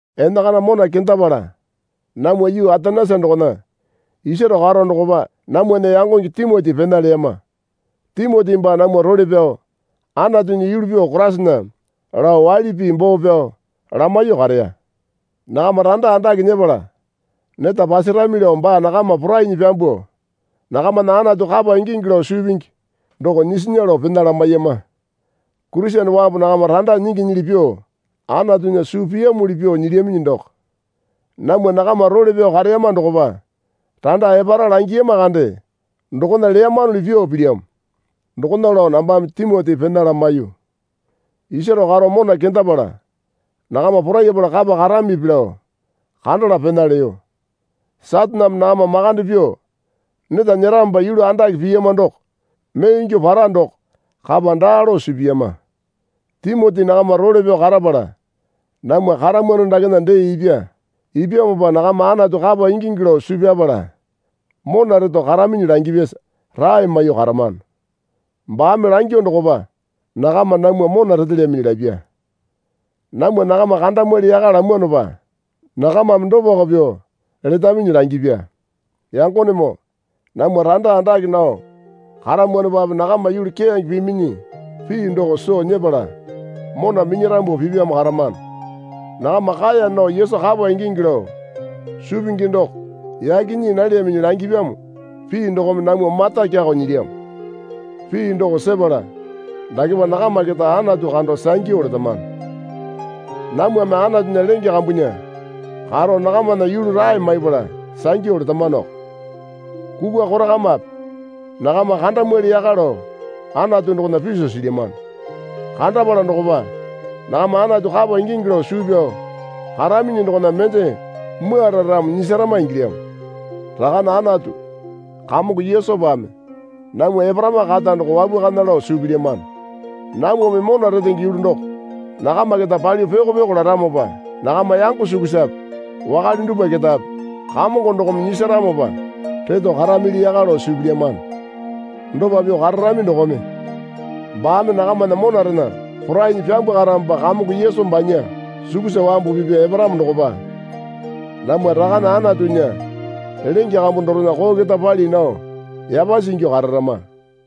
Enakana mona kendapala namwa yuu Atenesa dokona isaro karo dokopa namwana yangonge Timoti pena leyama. Timoti baa namwa role pyao Anatunya yulu pyuo Koraisana lao waili pii boo pyao lamaiyuo kareya. Nakama randa andake nyepala neta pasarami lao baa nakama porainyi pyambuo nakamana Anatu kapa ingingi lao suu pingi doko nyisinya lao pena lamaiyama. Kurisene wambu nakama randa nyinginyili pyuo Anatunya suu piyamuli pyuo nyilyaminyi doko. Namwa nakama role pyao kareyama dokopa randa epara langiyama kande dokona leyamanuli pyuo pilyamo. Dokona lao nambame Timoti pena lamaiyu. Isaro karo mona kendapala nakama porayapala kapa karamipi lao kandala pena leyo. Sataneme nakama makande pyuo neta nyeramopa yulu andake piyama doko mee ingyuo para doko kapa daa lao suu piyama. Timoti nakama role pyao karapala namwa karamwano dakena dee ipya. Ipyamopa nakama Anatu kapa ingingi lao suu pyapala mona reto karaminyi langipyasa rae maiyuo karamano. Baame langyuo dokopa nakama namwa mona retelyaminyi lapya. Namwa nakama kandamwali yaka lamwanopa nakamame dopako pyuo letaminyi langipya. Yangonemoo namwa randa andake nao karamwanopape nakama yulu keyange piminyi pii doko soo nyepala mona minyarambu pipyamo karamano. Nakama kaeya nao Yesu kapa ingingi lao suu pingi doko yaki nyii nalyaminyi langipyamo pii dokome namwa mata kyakao nyilyamo. Pii doko sepala dakepa nakama keta Anatu kando sangyu letamano. Namwame Anatunya lenge kambunya karo nakamana yulu rae maipala sangyu letamanoko. Kukwa korakamape nakama kandamwali yaka lao Anatu dokona piso silyamano. Kandapala dokopa nakama Anatu kapa ingingi lao suu pyao karaminyi dokona mende mwuara ramo nyisarama ingilyamo. Rakane Anatu, Kamongo Yesupame namwa eparama kata doko wapwakana lao suu pilyamano. Namwame mona retenge yulu doko nakama keta palyuo pyoko pyoko laramopa nakama yango sukusape wakale dupwa ketape Kamongo dokome nyisaramopa reto karamili yaka lao suu pilyamano. Dopa pyuo kararami dokome baame nakamana monarena porainyi pyambwakaramopa Kamongo Yesu banya sukusa wambu pipya eparamo dokopa namwa Rakane Anatunya lenge kambu dorena koo keta pali nao yapasi ingyuo kararama.